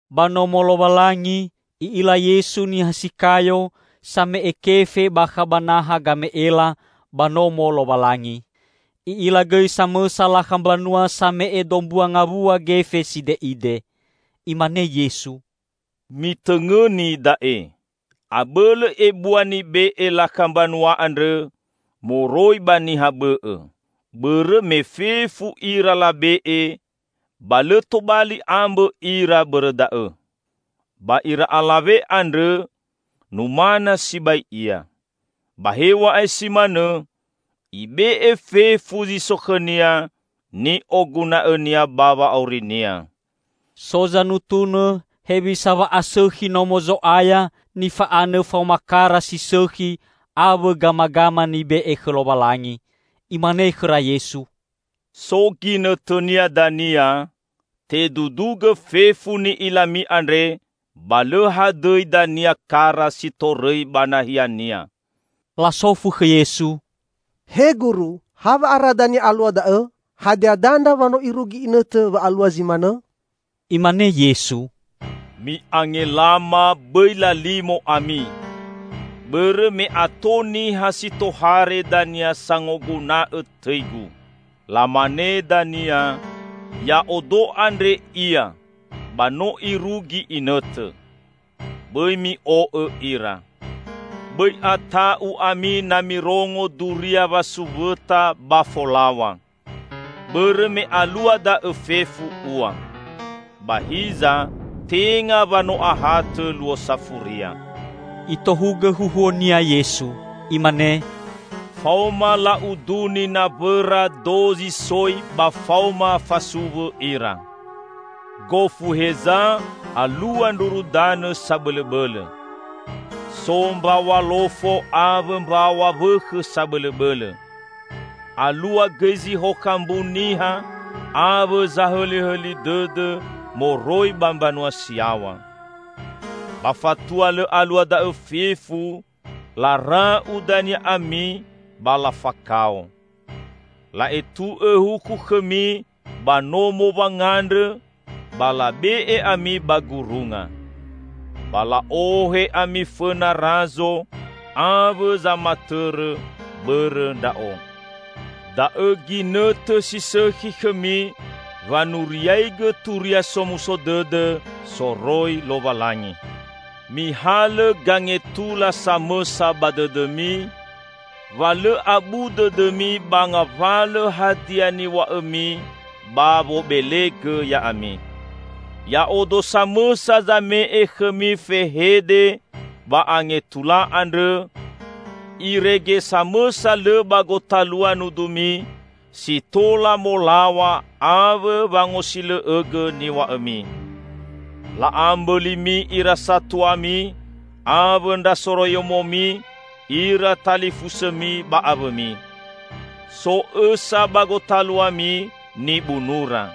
Ba Nomo Lowalangi, I'ila Yesu niha si kayo same'e kefe bakha ba naha game'ela ba Nomo Lowalangi. I'ila gõi samõsa lakha mbanua same'e dombua ngawua gefe side'ide. Imane Yesu, "Mitõngõni da'e: abõlõ ebua nibe'e lakha mbanua andrõ moroi ba niha bõ'õ. Bõrõ me fefu ira labe'e, ba lõ tobali ambõ ira bõrõ da'õ. Ba ira alawe andrõ, numana sibai ia. Ba hew̃a'ae si manõ, ibe'e fefu zi so khõnia ni'oguna'õnia ba wa'aurinia." So zanutunõ hewisa wa'asõkhi Nomo Zo'aya nifa'anõ faoma kara si sõkhi awõ gamagama nibe'e khõ Lowalangi. Imane khõra Yesu, "So ginõtõnia dania, tedudugõ fefu ni'ilami andre ba lõ hadõi dania kara si torõi ba nahiania!" Lasofu khõ Yesu, "He Guru, hawa'ara dania alua da'õ? Hadia dandra wa no irugi inõtõ wa'alua zi manõ?" Imane Yesu, "Mi'angelama, bõi lalimo ami. Bõrõ me ato niha si tohare dania sangoguna'õ tõi-Gu. Lamane dania, 'Ya'odo andre ia!' ba 'No irugi inõtõ.' Bõi mi'o'õ ira. Bõi ata'u ami na mirongo duria wasuwõta ba folaw̃a. Bõrõ me alua da'õ fefu ua. Ba hiza tenga wa no ahatõ luo safuria." Itohugõ huhuo-Nia Yesu. Imane, "Faoma la'uduni nawõra dozi soi ba faoma fasuwõ ira. Gofu heza alua ndruru danõ sabõlõbõlõ. So mbaw̃a lofo awõ mbaw̃a wõkhõ sabõlõbõlõ. Alua gõi zihokha mbu niha awõ zahõlihõli dõdõ moroi ba mbanua si yaw̃a. Ba fatua lõ alua da'õ fefu, lara'u dania ami ba lafakao. La'etu'õ huku khõmi ba nomo wangandrõ ba labe'e ami ba gurunga. Ba la'ohe ami fõna Razo awõ zamatõrõ bõrõ Ndra'o. Da'õ ginõtõ si sõkhi khõmi wanuriaigõ Turia Somuso Dõdõ soroi Lowalangi. Mihalõ gangetula samõsa ba dõdõmi, wa lõ abu dõdõmi ba ngawalõ hadia niw̃a'õmi ba wobelegõ ya'ami. Ya'odo samõsa zame'e khõmi fehede ba angetula andrõ, irege samõsa lõ ba gotalua nudumi si tola molaw̃a awõ wangosilõ'õgõ niw̃a'õmi. La'a mbõlimi ira satuami, awõ ndra soroiyomomi, ira talifusõmi ba awõmi. So õsa ba gotaluami nibunura.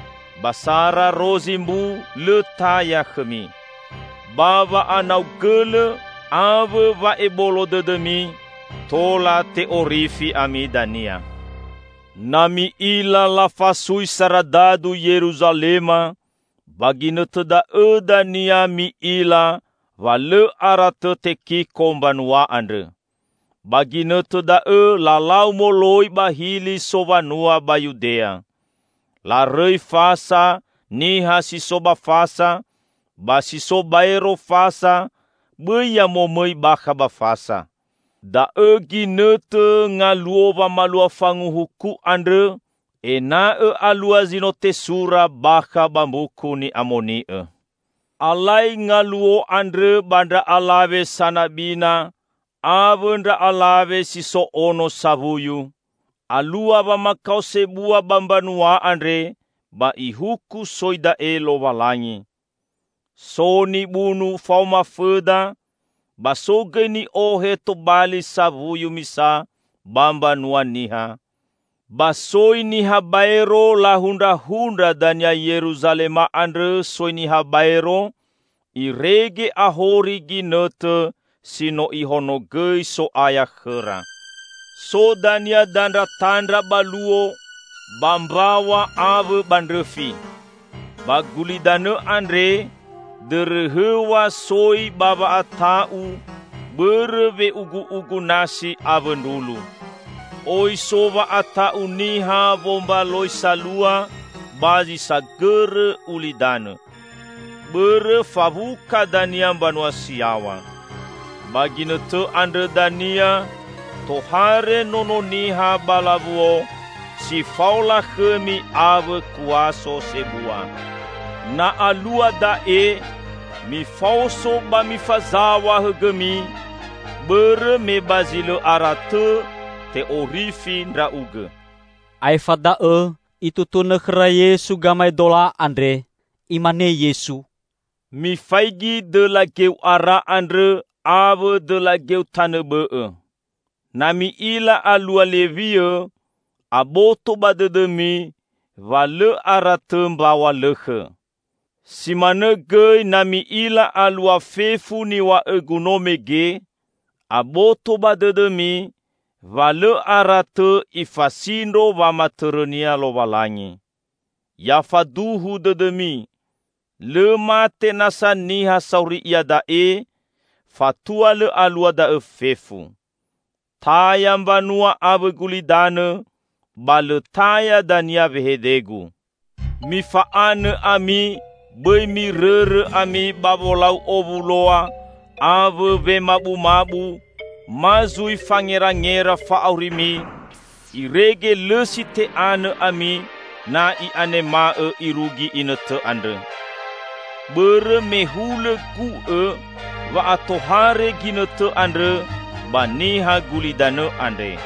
Ba sara rozi mbu lõ taya khõmi. Ba wa'anau gõlõ awõ wa'ebolo dõdõmi, tola te'orifi ami dania." "Na mi'ila lafasui saradadu Yeruzalema, ba ginõtõ da'õ dania mi'ila wa lõ ara tõ tekiko mbanua andrõ. Ba ginõtõ da'õ lalau moloi ba hili sowanua ba Yudea. Larõi fasa niha si so ba fasa, ba si so baero fasa bõi ya momõi bakha ba fasa. Da'õ ginõtõ 'Ngaluo Wamalua Fanguhuku', andrõ ena'õ alua zi no tesura bakha ba Mbuku Ni'amoni'õ. Alai ngaluo andrõ ba ndra alawe sanabina, awõ ndra alawe si so ono sawuyu! Alua wamakao sebua ba mbanua andre ba ihuku soi da'e Lowalangi. So nibunu faoma fõda, ba so gõi ni'ohe tobali sawuyu misa ba mbanua niha; ba soi niha baero lahundrahundra dania Yeruzalema andrõ soi niha baero, irege ahori ginõtõ si no Ihonogõi So'aya khõra." "So dania dandratandra ba luo, ba mbaw̃a awõ ba ndrõfi. Ba gulidanõ andre, dõrõhõw̃a soi ba wa'ata'u bõrõ we'ugu'ugu nasi awõ ndrulu. Oi so wa'ata'u niha wombaloi salua ba zi sagõrõ ulidanõ. Bõrõ fawuka dania mbanua si yaw̃a. Ba ginõtõ andrõ dania tohare Nono Niha ba lawuo si fao lakhõmi awõ kuaso sebua. Na alua da'e, mifaoso ba mifazaw̃a hõgõmi, bõrõ me ba zi lõ ara tõ te'orifi ndra'ugõ." Aefa da'õ itutunõ khõra Yesu gamaedola andre. Imane Yesu, "Mifaigi dõla geu ara andrõ awõ dõla geu tanõ bõ'õ. Na mi'ila alua lewiõ, aboto ba dõdõmi wa lõ ara tõ mbaw̃a lõkhõ. Si manõ gõi na mi'ila alua fefu niw̃a'õ-Gu no mege, aboto ba dõdõmi wa lõ ara tõ Ifasindro wamatõrõ-Nia Lowalangi. Ya faduhu dõdõmi! Lõ mate nasa niha sauri iada'e, fatua lõ alua da'õ fefu. Taya mbanua awõ gulidanõ, ba lõ taya dania wehede-Gu." "Mifa'anõ ami, bõi mirõrõ ami ba wolau owuloa awõ wemabumabu, ma zui fangerangera fa'aurimi, irege lõ si te'anõ ami na i'anema'õ irugi inõtõ andrõ. Bõrõ me hulõ gu'õ wa'atohare ginõtõ andrõ ba niha gulidanõ andre.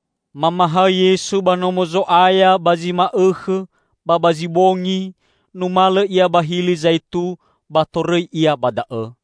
Mamahaõ Yesu ba Nomo Zo'aya ba zi ma'õkhõ, ba ba zi bongi numalõ Ia ba Hili Zaitu ba torõi Ia ba da'õ.